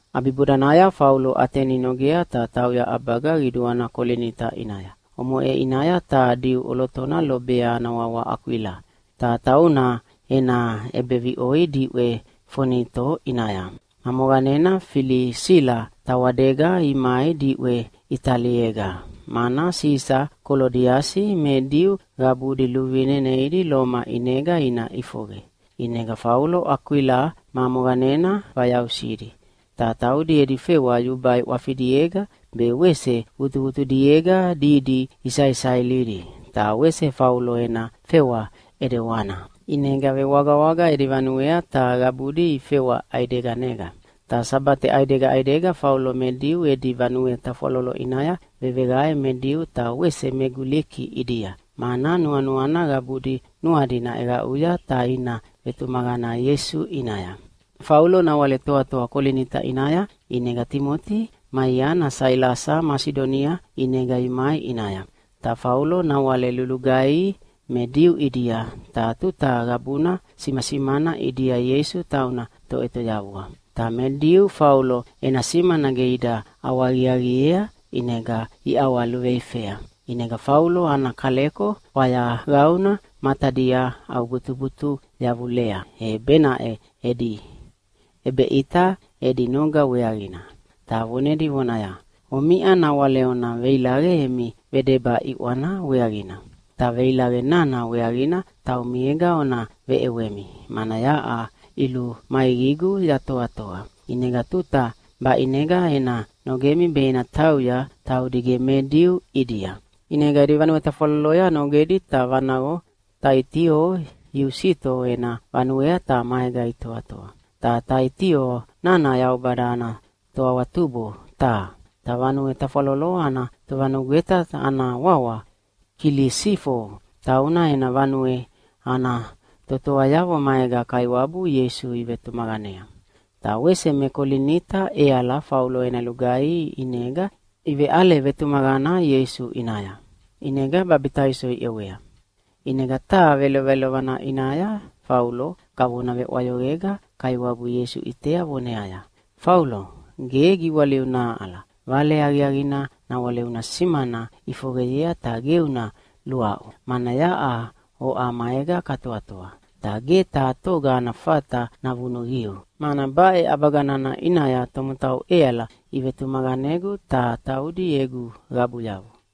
ʼAbibodanaya Faulo Ateni nogea ta tauya ʼabaga qiduana Kolinita ʼinaya. Omoʼe ʼinaya taha Diu ʼolotona lobea ana wawa Akwila, ta tauna ena ʼebeviʼoi diʼwe Fonito ʼinaya. Ma moqanena Filisila tawadega imai diʼwe Italiega, mana Sisa Kolodiasi me Diu qabudi luvine neidi Loma ʼinega ina ʼifoqe. ʼInega Faulo Akwila ma moqanena vayausidi. Ta taudi edi fewa yubai ʼwafidiega be wese vutuvutudiega didi isaisailidi, ta wese Faulo ena fewa ʼedewana. ʼInega vewagawaga edi vanuea ta qabudi ifewa ʼaideganega. Ta Sabate ʼaidega ʼaidega Faulo me Diu edi vanue tafwalolo ʼinaya veveqae me Diu ta wese me Guliki ʼidia, mana nuanuana qabudi nuadi naʼeqaʼuya ta ina vetumaqana Ieisu ʼinaya. Faulo nawale toatoa Kolinita ʼinaya, ʼinega Timoti ma iana Sailasa Masidonia ʼinega imai ʼinaya. Ta Faulo nawale lulugaihi me Diu ʼidia, ta tuta qabuna simasimana ʼidia Ieisu tauna Toʼetoyavua. Ta me Diu Faulo ena simana ge ida ʼawahaqiaqiea, ʼinega iʼawaluveifea. ʼInega Faulo ana kaleko fwayaqauna matadia ʼaubutubutu yavulea, e benaʼe edi ʼebeʼita edi noga weaqina, ta vonedi vonaya, “Omiʼa nawale ona veilaqe emi vedeba ʼiʼwana weaqina. Ta veilaqe nana weaqina taumiega ona veʼewemi, mana yaʼa ʼilumaiqigu yatoatoa. ʼInega tuta baʼinega ena nogemi be ena tauya taudi ge me Diu ʼidia!” ʼInega edi vanue tafwaloloya nogedi ta vanaqo Taitio Iusito ena vanuea ta maega itoatoa. Ta Taitio nana Yaubada ana toawatubo taha. Ta vanue tafwalolo ana tovanugweta ana wawa Kilisifo, tauna ena vanue ana totoayavo maega Kaiwabu Ieisu ivetumaqanea. Ta wese me Kolinita ʼeala Faulo ena lugaihi ʼinega iveʼale vetumaqana Ieisu ʼinaya, ʼinega babitaiso iʼewea. ʼInega taha velovelovana ʼinaya Faulo kavona veʼwayoqega Kaiwabu Ieisu ʼitea voneaya, “Faulo, ge giwaliu nahaʼala. Vale Aqiaqina nawale una simana ʼifoqeyea, ta ge una luaʼu, mana yaʼa oʼa maega katoatoa. Ta ge taha toga ana fata navunuqiu, mana baʼe ʼabaga nana ʼinaya tomotau ʼeala ivetumaqanegu ta taudi egu qabuyavo.”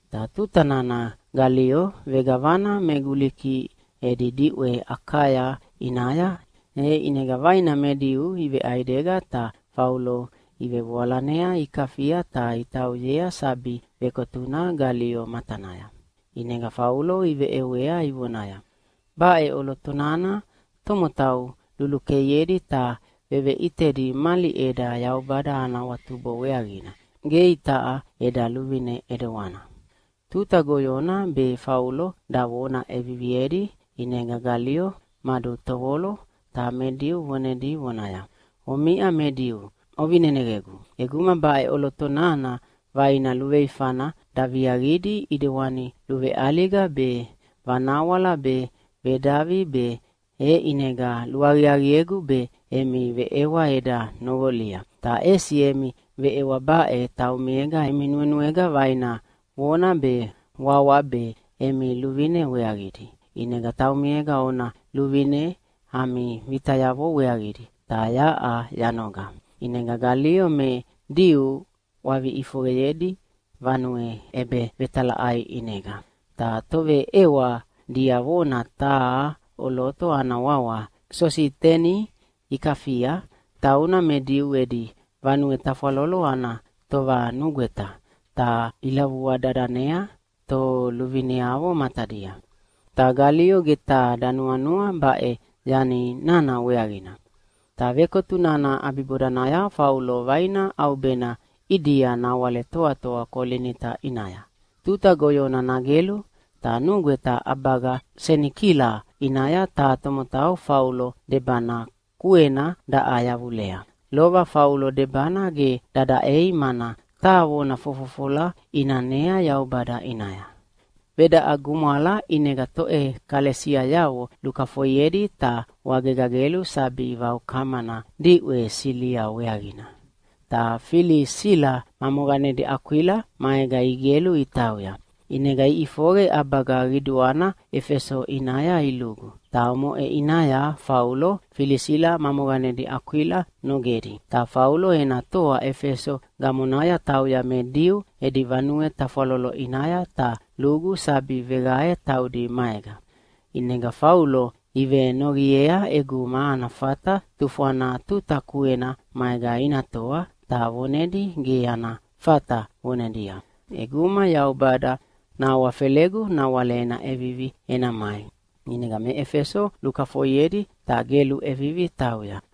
Ta tuta nana Galio vegavana me Guliki edi diʼwe Akaya ʼinaya, e ʼinega vaina me Diu iveʼaidega ta Faulo ivevoalanea ikafia ta itauyea sabi vekotuna Galio matanaya. ʼInega Faulo iveʼewea ivonaya, “Baʼe ʼoloto nana tomotau lulukeiedi ta veveʼitedi mali ʼeda Yaubada ana awatubo weaqina, ge itaʼa eda luvine ʼedewana.” Tuta goyona be Faulo davona ʼeviviedi, ʼinega Galio madutovolo ta me Diu vonedi vonaya, “Omiʼa me Diu, ovineneqegu! ʼEguma baʼe ʼoloto nana vaina luveifana daviaqidi ʼidewani luveʼaliga be, vanawala be, vedavi be, e ʼinega luaqiaqiegu be emi veʼewa eda noqolia. Ta ʼesi emi veʼewa baʼe taumiega emi nuenuega vaina vona be wawa be emi luvine weaqidi, ʼinega taumiega ona luvine ami vitayavo weaqidi, ta yaʼa yanoga.” ʼInega Galio me Diu ʼwavi ʼifoqeyedi vanue ʼebevetalaʼai ʼinega. Ta toveʼewa diavona taha ʼoloto ana wawa Sositeni ikafia, tauna me Diu edi vanue tafwalolo ana tovanugweta, ta ilavua dadanea toluvineavo matadia. Ta Galio ge taha danuanua baʼe yani nana weaqina. Ta vekotu nana ʼabibodanaya Faulo vaina ʼaubena ʼidia nawale toatoa Kolinita ʼinaya. Tuta goyona nagelu, ta nugweta ʼabaga Senikila ʼinaya taha tomotau Faulo debana kuena daʼa yavulea. Lova Faulo debana ge dadaʼei, mana taha vona fofofola ʼinanea Yaubada ʼinaya. Vedaʼa gumwala ʼinega toʼekalesiayavo lukafoiedi ta wagega gelu sabi vaukamana diʼwe Silia weaqina. Ta Filisila ma moqanedi Akwila maega igelu itauya. ʼInega iʼifoqe ʼabaga qiduana Efeso ʼinaya ilugu, ta omoʼe ʼinaya Faulo Filisila ma moqanedi Akwila nogedi. Ta Faulo ena toa Efeso gamonaya tauya me Diu edi vanue tafwalolo ʼinaya ta lugu sabi veqae taudi maega. ʼInega Faulo ivenoqiea ʼeguma ana fata tufwana tuta kuena maega ina toa, ta vonedi ge ana fata, vonedia, “ʼEguma Yaubada nahawafelegu nawale ena ʼevivi ena mai.” ʼInega me Efeso lukafoiedi ta gelu ʼevivi tauya.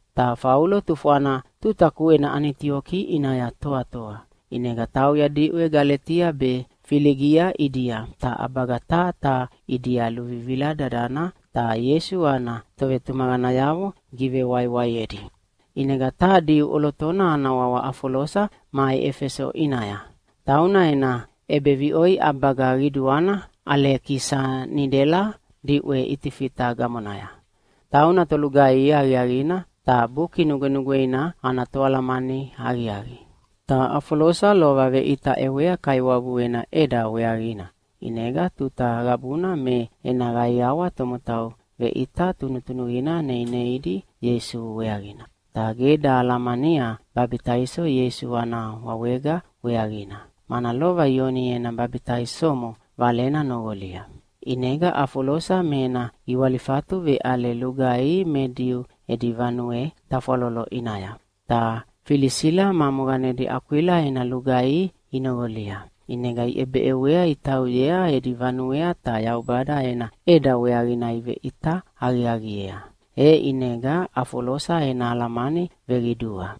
Ta Faulo tufwana tuta kuena Anitioki ʼinaya toatoa. ʼInega tauya diʼwe Galetia be Filigia ʼidia, ta ʼabaga taha taha ʼidia luvivila dadana ta Ieisu ana tovetumaqanayavo givewaiwaiedi. ʼInega taha Diu ʼolotona ana wawa Afolosa mai Efeso ʼinaya. Tauna ena ʼebeviʼoi ʼabaga qiduana Alekisanidela diʼwe Itifita gamonaya. Tauna tolugaihi aqiaqina ta Buki Nugwenugweina ana toalamani aqiaqi. Ta Afolosa lova veʼita ʼewea Kaiwabu ena ʼeda weaqina, ʼinega tuta qabuna me ena qaiawa tomotau veʼita tunutunuqina neineidi Ieisu weaqina. Ta ge dahalamania babitaiso Ieisu ana wawega weaqina, mana lova Ioni ena babitaisomo valena noqolia. ʼInega Afolosa me ena giwalifatu veʼale lugaihi me Diu edi vanue tafwalolo ʼinaya. Ta Filisila ma moqanedi Akwila ena lugaihi inoqolia. ʼInega iʼebeʼewea itauyea edi vanuea ta Yaubada ena ʼeda weaqina iveʼita aqiaqiea, e ʼinega Afolosa ena alamani veqidua.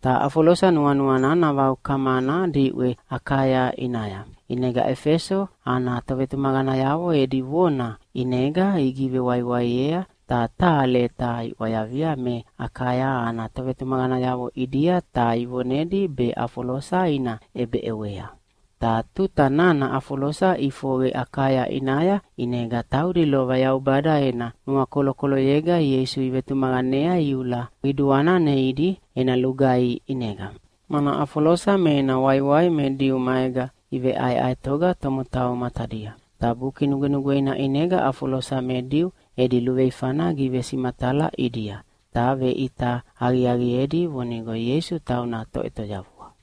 Ta Afolosa nuanuana navaukamana diʼwe Akaya ʼinaya. ʼInega Efeso ana tovetumaqanayavo edi vona ʼinega igivewaiwaiea, ta taha leta iʼwayavia me Akaya ana tovetumaqanayavo ʼidia ta ivonedi be Afolosa ina ʼebeʼewea. Ta tuta nana Afolosa ʼifoqe Akaya ʼinaya, ʼinega taudi lova Yaubada ena nuakolokoloyega Ieisu ivetumaqanea iula qiduana neidi ena lugaihi ʼinega, mana Afolosa me ena waiwai me Diu maega iveʼaeʼaetoga tomotau matadia. Ta Buki Nugwenugweina ʼinega Afolosa me Diu edi luveifana givesimatala ʼidia, ta veʼita aqiaqiedi vonigo Ieisu tauna Toʼetoyavua.